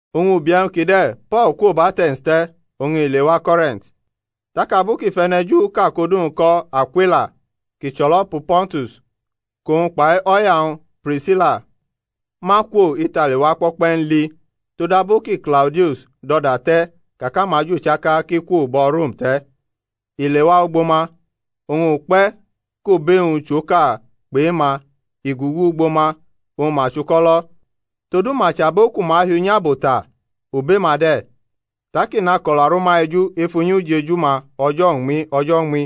Oñ ubi e̩wñ kide̩ Po̩l kwo bʼAte̩ns te̩ oñ i lewa Ko̩rint; tak abu kʼi fʼe̩ne̩Juʼka kʼodu-wñ ko̩ Akwila, kʼi chʼo̩lo̩pu Pontus kʼowñ kpai o̩ya-wñ Prisila ma kwo Itali wa kpo̩kpe̩ n li (todabu ki Klaudius dʼo̩da te̩ ka kʼamaju chaka ki kwo bo̩ Rom te̩); i lewa ugbo ma; oñ ukpe̩ kʼobe-wñ chʼoka kpʼe-ma, i gugu ugbo ma oñ ma chuko̩lo̩; todu ma chʼabo ku ma hi unyabo ta, obe-ma de̩. Tak i nako̩la rʼuma eju ef unyi ujeju-ma o̩jo̩ uñmi o̩jo̩ uñmi,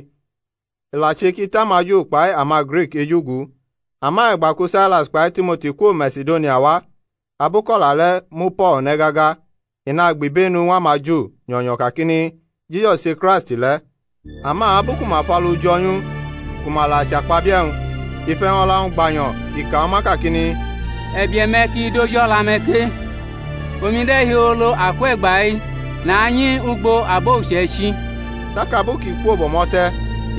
i la che kʼi tʼamaJu kpai amaGrik eju gu. Ama e̩gba ku Sailas kpai Timoti kwo Masidonia wa, abu kʼo̩la le̩ mu Po̩l ne̩ gaga i nagbibenu ñw amaJu nyo̩nyo̩ kakini, Jisus che Kraist le̩. Ama abu ku ma fʼalu jo̩ nyʼu ku ma la chʼakpabie̩-wñ, i fʼe̩wñ o̩la-wñ gbanyo̩, i ka ñw uma kakini, E̩bie̩-me̩ ki dʼoji o̩la-me̩ ke, omi de̩ hiolo, akwe̩gba-i nanyi ugbo abo uche̩ichi. Tak abu kʼi kwo bʼo̩mo̩ te̩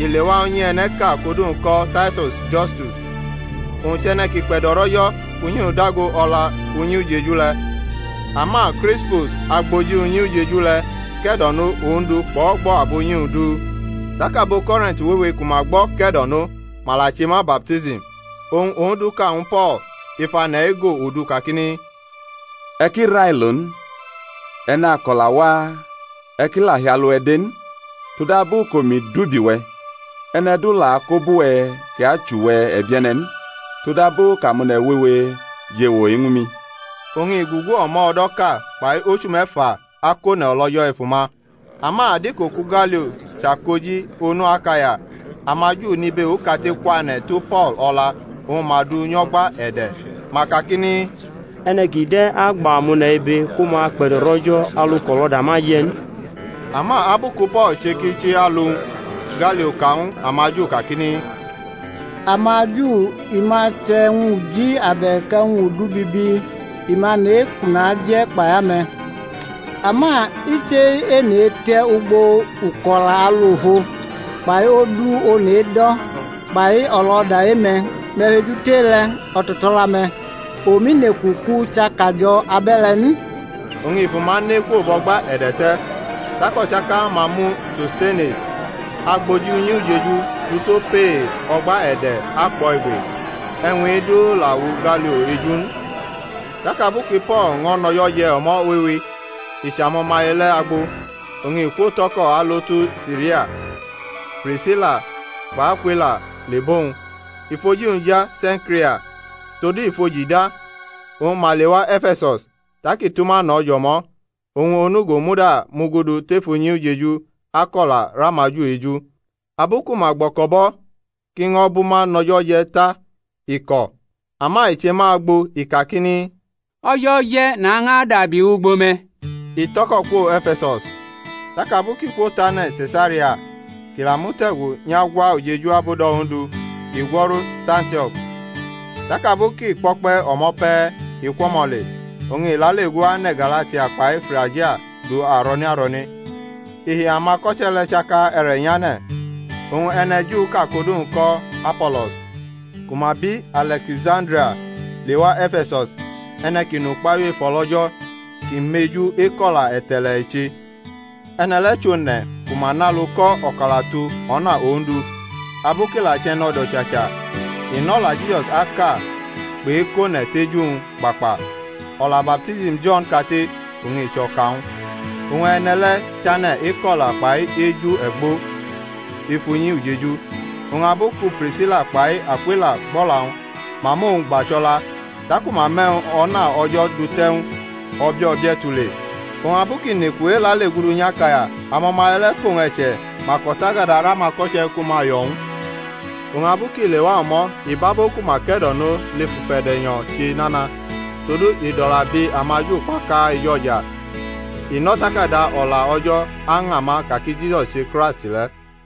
i lewa unyi e̩ne̩ʼka kʼodu-wñ ko̩ Taito̩s Justus, owñ chʼe̩ne̩ kʼi kpe̩do̩rʼO̩jo̩ kʼunyi-wñ dago o̩la unyi ujeju le̩. Ama Krispus, agboji unyi ujeju le̩, ke̩do̩no Ondu kpʼo̩gbo̩ abunyi-wñ du; tak abo Ko̩rint wewe kʼuma gbo̩ ke̩do̩no, ma la che ma baptism. Oñ Ondu ka ñw Po̩l ef ane̩ ego odu kakini, E̩ ki railo n, e̩ nako̩la waa, e̩ ki la hi alu-we̩ de n: todabu kʼomi dʼubi-we̩, e̩ne̩ du la akobʼuwe̩ kʼi achʼuwe̩ e̩bie̩ne̩ n; todabu kʼamone̩ wewe jʼewo-i ñw mi. Oñ i gugu o̩mo̩ o̩do̩ʼka kpai ochu me̩fa akone̩ o̩lO̩jo̩ ef uma. Ama adiko ku Galio chʼakoji-onu Akaya, amaJu nʼibe okate kwane̩ tu Po̩l o̩la oñ ma dʼu nyʼo̩gba-e̩de̩; ma kakini, E̩ne̩ kide̩ agba amone̩ ibe ku ma kpe̩do̩rʼO̩jo̩ alu kʼo̩lo̩da ma je̩ n. Ama abu ku Po̩l che kʼi chi alu-wñ, Galio ka ñw amaJu kakini, AmaJu, i ma chʼe̩wñ uji abe̩k e̩wñ udu bibi, i ma nʼe-i kʼu naje̩ kpai ame̩; ama i chʼe-ene e̩te̩ ugbo uko̩la alu ofo, kpai odu one̩ edo̩ kpai o̩lo̩da e-me̩, me̩ fejutʼe-le̩ o̩to̩to̩la-me̩; omi neku kʼu chʼakajo̩ abe̩le̩ n. Oñ i fʼuma ne kwo bʼo̩gba e̩de̩ te̩. Tak o̩chaka-ma mu Sostenes, agboji unyi ujeju, du tʼopee o̩gba e̩de̩ akpʼo̩ igbe. E̩wñ-i du la wu Galio eju n. Tak abu ki Po̩l ño̩ nʼo̩jo̩ je̩ o̩mo̩ wewe, i chʼamo̩maye le̩ agbo, oñ i kwotʼo̩ko̩ alo tu Siria, Prisila kpʼAkwila le bʼowñ (i fʼoji-wñ ja Se̩nkria; todu i fʼoji da). Oñ ma lewa E̩fe̩sus, tak i tʼuma no̩ jʼo̩mo̩; owñ onugo muda mugudu tef unyi ujeju akʼo̩la rʼamaJu eju. Abu ku ma gbo̩ko̩bʼo̩ kʼi ño̩ bʼuma nʼo̩jo̩ je̩ ta, i ko̩. Ama i che ma agbo, i kakini, O̩jo̩ je̩, nañʼadabi wʼugbo me̩. I tʼo̩ko̩ kwo E̩fe̩sus. Tak abu kʼi kwotʼane̩ Se̩saria, kʼi la mute̩gu nyʼagwa ujeju abudo̩ Ondu, i gwo̩ru tʼAntio̩k. Tak abu kʼi kpo̩kpe̩ o̩mo̩ pe̩ i kwʼo̩mo̩ le, oñ i lale gu ane̩ Galatia kpai Frigia du aro̩ne aro̩ne, i hi amako̩che̩ le̩ chaka e̩re̩ nyane̩. Oñ e̩ne̩Juʼka kʼodu-wñ ko̩ Apo̩lo̩s, ku ma bi Ale̩kisandria, lewa E̩fe̩sus; e̩ne̩ kʼi nʼukpahiu ef o̩lO̩jo̩, kʼi meju eko̩la e̩te̩le̩ i che. E̩ne̩ le̩ chʼone̩ ku ma nʼalu ko̩ o̩kalatu o̩na Ondu; abu kʼi la chʼe̩ne̩do̩ chacha, i nʼo̩la Jisus aka kpʼe̩kʼone̩ tʼeju-wñ kpakpa; o̩la baptism Jo̩n kate oñ i chʼo̩ka-wñ. Oñ e̩ne̩ le̩ chane̩ eko̩la kpai eju e̩gbo̩ ef unyi ujeju. Oñ abu ku Prisila kpai Akwila gbʼo̩la-wñ, ma mʼowñ gba cho̩la, taku ma mʼe̩wñ o̩na O̩jo̩ dute̩ ñw u o̩bie̩ o̩bie̩ tule. Oñ abu ki neku elalegudu nyʼAkaya amo̩maye le̩ kʼowñ e̩che, ma kʼo̩takada rʼamako̩che̩ ku ma yo̩ ñw u: oñ abu kʼi lewa o̩mo̩ i bʼabo ku ma ke̩do̩no lef ufe̩de̩-nyo̩ che nana; todu i dʼo̩la bi amaJu kpaka ejo̩ja, i nʼO̩takada O̩la O̩jo̩ aña ma ka ki Jisus che Kraist le̩.